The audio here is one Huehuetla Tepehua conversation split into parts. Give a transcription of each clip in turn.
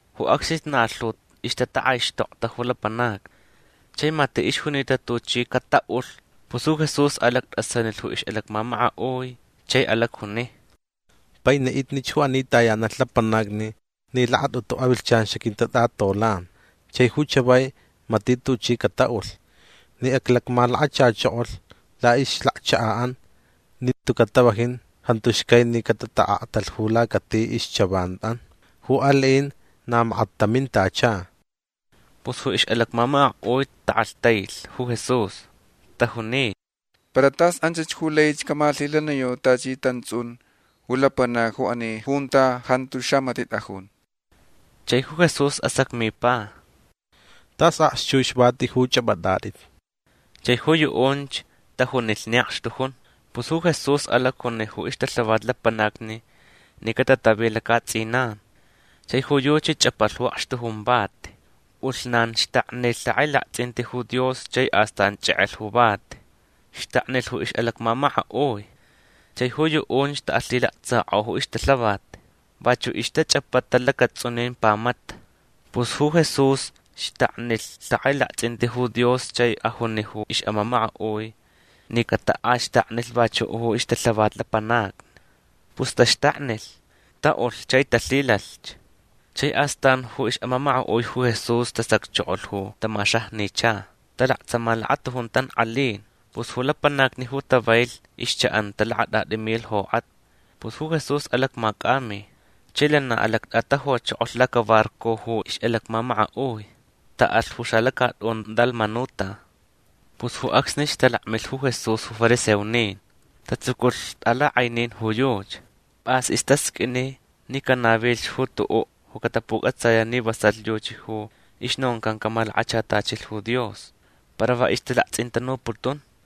Ju acsnich na lhu ixtatak'aixtokta ju lapanacni. Chai mati' ixjunita tuchi cata'ulh. Pus ju Jesús alact'asanilh ju ix'alacmamaka'ui chai alacjuni: ―Paini'itnich ju ani tayanalh lapanacni ni lakat'utu avilhchan xaquintat'atolan chai ju chavai mati' tuchi cata'ulh. Ni aclacmalakachachokolh la'ixlacchaka'an nin tuca' tavajin jantu xcai ni catata'aktalh ju lacati ixchavan'an. Ju ali'in na makat tamintacha. Pus ju ix'alacmamaka'ui tak'alhtailh ju Jesús. Tajuni: ―Para tas anchach ju lai camalhilaniyau tachi tants'un ju lapanacni ju ani junta jantu xamati' t'ajun. Chai ju Jesús asacmipa: ―Tas akxchux vati ju ch'ap'at'at'it. Chai ju yu'unch tajunilh ni akxtujun. Pus ju Jesús alacjuni ju ixtalhavat lapanacni ni catatavi laca'ats'inan. Chai ju yuchi ch'apalh ju akxtujun vati. P'ulhnan xtaknilh lhak'ailakts'inti ju Dios chai astan ch'ek'elh ju vati. Xtaknilh ju ix'alacmamaka'ui. Chai ju yu'unch ta'alhilaktsak'o ju ixtalhavat. Vachu' ixtach'apata lacats'unin pamata. Pus ju Jesús xtaknilh lhak'ailakts'inti ju Dios chai ajunich ju ix'amamaka'ui ni cata'axtaknilh vachu' ju ixtalhavat lapanacni. Pus taxtaknilh. Ta'ulh chai talhilalhch. Chai astan ju ix'amamaka'ui ju Jesús tasacchokolh ju tamaxajnicha. Talaktsama lakatujun tank'alin. Pus ju lapanacni ju tavailh ixcha'anta lakat'at'i milh jok'atni. Pus ju Jesús alacmac'ami. Chai lana alact'atajuchokolh lacabarco ju ix'alacmamaka'ui. Ta'alh ju xalacat'un Dalmanuta. Pus ju acsnich talakmilh ju Jesús ju fariseonin. Tatsuculh t'alak'ainin ju yuchi. P'as istasq'uini ni canavilh ju tu'u' ju catapuc'atsaya' ni vasalh yuchi ju ixnoncan camalakachatachilh ju Dios. Para va ixtalakts'intanuputun.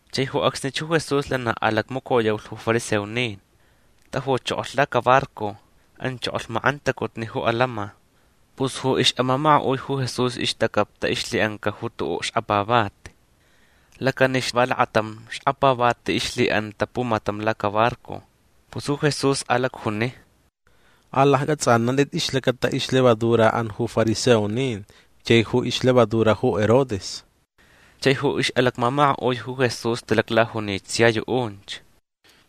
Chai ju acsnich ju Jesús lana alacmacoyaulh ju fariseonin. Tajuchokolh lacabarco. Anchokolh mak'antacutni ju atants'in. Pus ju ix'amamaka'ui ju Jesús ixtacaptach ixlhi'anca ju tu'u' xkapavati. Lacanix va lakatam xkapavati ixlhi'anta pumatam lacabarco. Pus ju Jesús alacjuni: ―Alacc'ats'anant'it ixlacata ixlevadura'an ju fariseonin chai ju ixlevadura ju Herodes. Chai ju ix'alacmamaka'ui ju Jesús talaclajunich sia yu'unch: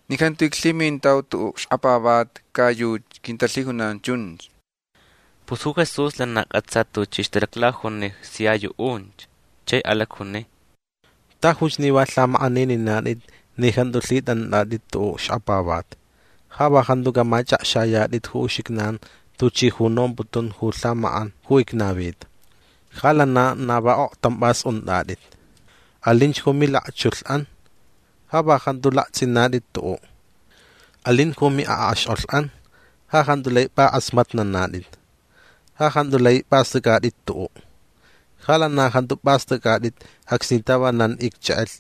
―Ni jantu iclhimintau tu'u' xkapavati ca yuchi quintalhijunan chunch. Pus ju Jesús lana c'atsa tuchi ixtalaclajuni sia yu'unch. Chai alacjuni: ―Tajuch ni va lhamak'anininat'it ni jantu lhit'ant'at'it tu'u' xkapavati. Ja va jantuca' mach'akxayat'it ju uxijnan tuchi ju nomputun ju lhamak'an ju icnavita. Ja lana na va oktanp'as unt'at'it. Alinch ju milakchulh'an. Ja va jantu lakts'inat'it tu'u'. Alin ju mi'ak'axk'olh'an. Ja jantu lai p'ak'asmatnanat'it. Ja jantu lai p'ast'ac'at'it tu'u'. Ja lana jantu p'ast'ac'at'it acsni tavanan icch'ek'elh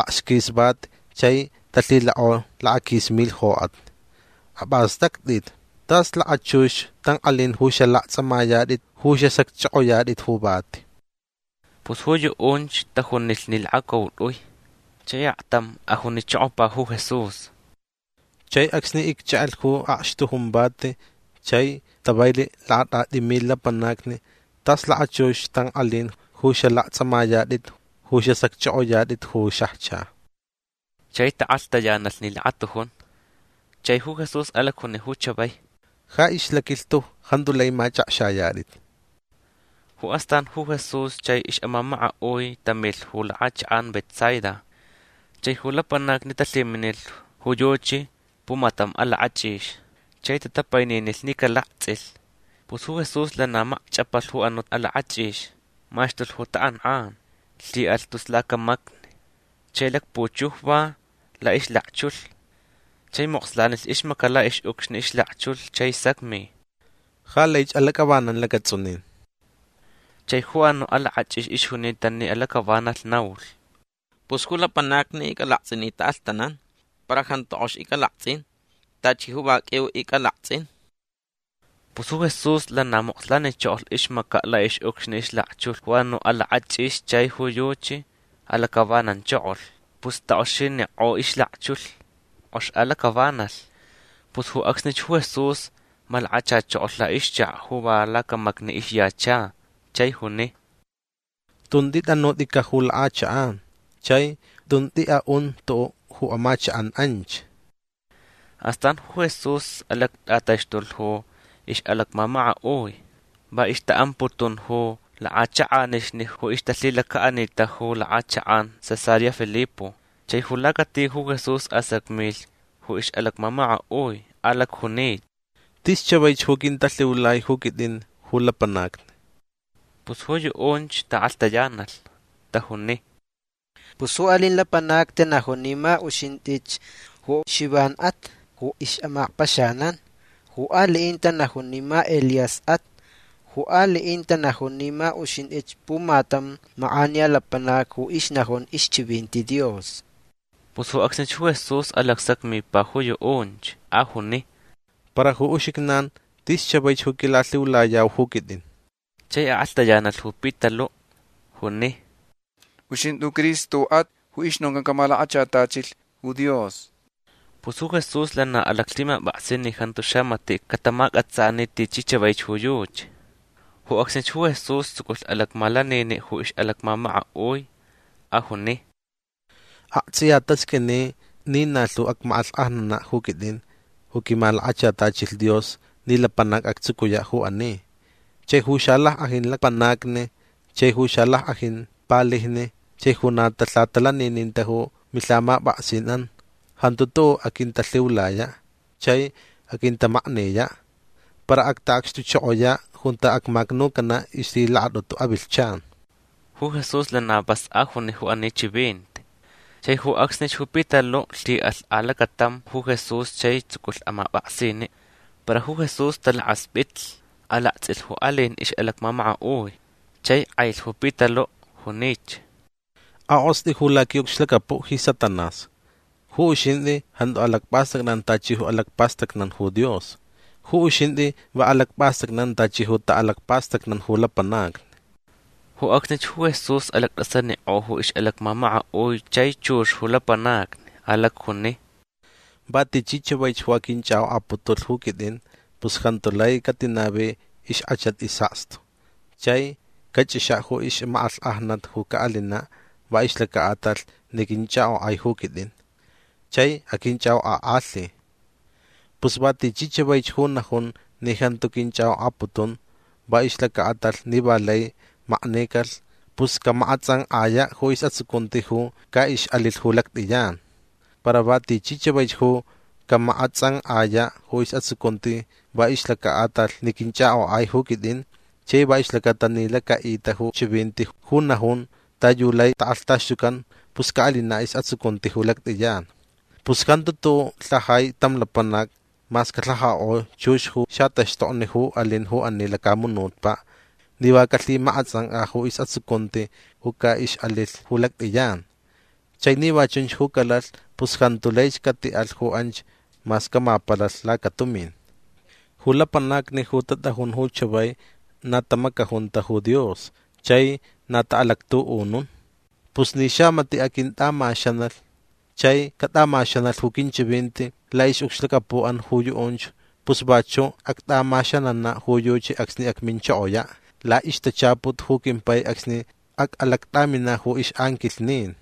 akxquis vati chai talhilak'o lakaquis milh jok'atni. Ap'ast'act'it. Tas lakachux tank'alin ju xalakts'amayat'it ju xasacch'ok'oyat'it ju vati. Pus ju yu'unch tajunilh ni lakacaut'ui. Chai aktam ajunichokopa ju Jesús: ―Chai acsni icch'ek'elh ju akxtujun vati chai tavailh lakat'at'i milh lapanacni tas lakachux tank'alin ju xalakts'amayat'it ju xasacch'ok'oyat'it ju xajcha. Chai tak'alhtayanalh ni lakatujun. Chai ju Jesús alacjunich ju chavai: ―Ja ixlaquilhtu jantu lai mach'akxayat'it. Ju astan ju Jesús chai ix'amamaka'ui tamilh ju lak'achak'an Betsaida. Chai ju lapanacni talhiminilh ju yuchi pumatam alak'ach'ix. Chai tatapaininilh ni calakts'ilh. Pus ju Jesús lana makch'apalh ju anu' alak'ach'ix. Maxtulh ju tak'ank'an. Lhi'alh tus lacamacni. Chai lakpuchujva la'ixlakchulh. Chai mokslanilh ixmaca' la'ix'ucxni ixlakchulh chai sacmi: ―Ja laich alac'avanan lacats'unin. Chai ju anu' alak'ach'ix ixjunita ni alac'avanalh naulh: ―Pus ju lapanacni ic'alakts'in ni ta'alhtanan. Para jantu k'ox ic'alakts'in. Tachi ju va q'uiu ic'alakts'in. Pus ju Jesús lana mokslanichokolh ixmaca' la'ix'ucxni ixlakchulh ju anu' alak'ach'ix chai ju yuchi alac'avananchokolh. Pus tak'oxinik'o ixlakchulh. K'ox alac'avanalh. Pus ju acsnich ju Jesús malakachachokolh la'ixchaka' ju va lacamacni ixyacha. Chai juni: ―Tun t'it'anut'ica' ju lak'achak'an. Chai tun t'i'a'un tu'u' ju amachak'an anch. Astan ju Jesús alact'ataxtulh ju ix'alacmamaka'ui. Va ixta'amputun ju lak'achak'anixni ju ixtalhilaca'anita ju lak'achak'an Cesarea Filipo. Chai ju lacati ju Jesús asacmilh ju ix'alacmamaka'ui. Alacjuni: ―Tis chavaich ju quintalhiulai ju quit'in ju lapanacni. Pus ju yu'unch tak'alhtayanalh. Tajuni: ―Pus ju ali'in lapanacni tanajun ni ma uxint'ich ju Xivan'at ju ix'amakpaxanan. Ju ali'in tanajun ni ma Elías'at. Ju ali'in tanajun ni ma uxint'ich pumatam mak'aniya lapanac ju ixnajun ixchivinti Dios. Pus ju acsnich ju Jesús alacsacmipa ju yu'unch. Ajuni: ―Para ju uxijnan tis chavaich ju quilalhiulayau ju quit'in. Chai ak'alhtayanalh ju Pitalu'. Juni: ―Uxint'i ju Cristo'at ju ixnoncan camalakachatachilh ju Dios. Pus ju Jesús lana alaclhimap'aksi ni jantu xamati' catamac'atsani tichi chavaich ju yuchi. Ju acsnich ju Jesús tsuculh alacmalanini' ju ix'alacmamaka'ui. Ajuni: ―Akts'iya tasq'uini ni na lhu acmak'alhk'ajnana' ju quit'in ju quimalakachatachilh Dios ni lapanac actsucuya' ju ani. Chai ju xalack'ajin lapanacni chai ju xalack'ajin palijni chai ju na talhatalanininta ju milhamap'aksin'an jantu tu'u' aquintalhiulaya'. Chai aquintamakniya'. Para acta'acxtuchokoya' junta acmacnucana' ixlhilakat'utu avilhchan. Ju Jesús lana vas ajuni ju ani chivinti. Chai ju acsnich ju Pitalu' lhi'alh alacatam ju Jesús chai tsuculh amap'aksini'. Para ju Jesús talakasp'itlh. Alakts'ilh ju ali'in ix'alacmamaka'ui. Chai k'ailh ju Pitalu'. Junich: ―Ak'ost'i ju laqui'ucxlacapu' ji Satanás. Ju uxint'i jantu alacp'ast'acnan tachi ju alacpastacnan ju Dios. Ju uxint'i va alacp'ast'acnan tachi ju ta'alacpastacnan ju lapanacni. Ju acsnich ju Jesús alact'asanik'o ju ix'alacmamaka'ui chai chux ju lapanacni. Alacjuni: ―Va tichi chavaich ju aquinch'ak'ok'aputulh ju quit'in pus jantu lai catinavi ixk'achat is'akstu. Chai cach'ixa' ju ixmak'alhk'ajnat ju ca'alina' va ixlaca'atalh ni quinch'ak'ok'ai ju quit'in. Chai aquinch'ak'ok'ak'alhi. Pus va tichi chavaich ju najun ni jantu quinch'ak'ok'aputun va ixlaca'atalh ni va lai maknicalh pus camak'ats'ank'aya' ju is'atsucunti ju ca'ix'alilh ju lact'iyan. Para va tichi chavaich ju camak'ats'ank'aya' ju is'atsucunti va ixlaca'atalh ni quinch'ak'ok'ai ju quit'in chai va ixlacata ni laca'ita ju chivinti ju najun ta yu lai tak'alhtaxtucan pus ca'alina' is'atsucunti ju lact'iyan. Pus jantu tu'u' lhajai tam lapanac mas calhajak'o chux ju xataxtokni ju alin ju ani lacamunutpa' ni va calhimak'ats'ank'a ju is'atsucunti ju ca'ix'alilh ju lact'iyan. Chai ni va chunch ju calalh pus jantu laich cati'alh ju anch mas camapalalh lacatumin. Ju lapanacni ju tat'ajun ju chavai na tamacajunta ju Dios chai na ta'alactu'unun. Pus ni xamati' aquint'amaxanalh chai cat'amaxanalh ju quinchivinti la'ix'ucxlacapu'an ju yu'unch pus vachu' act'amaxanana' ju yuchi acsni acminchokoya' la'ixtachaput ju quimpai acsni ac'alact'amina' ju ix'anquilhnin.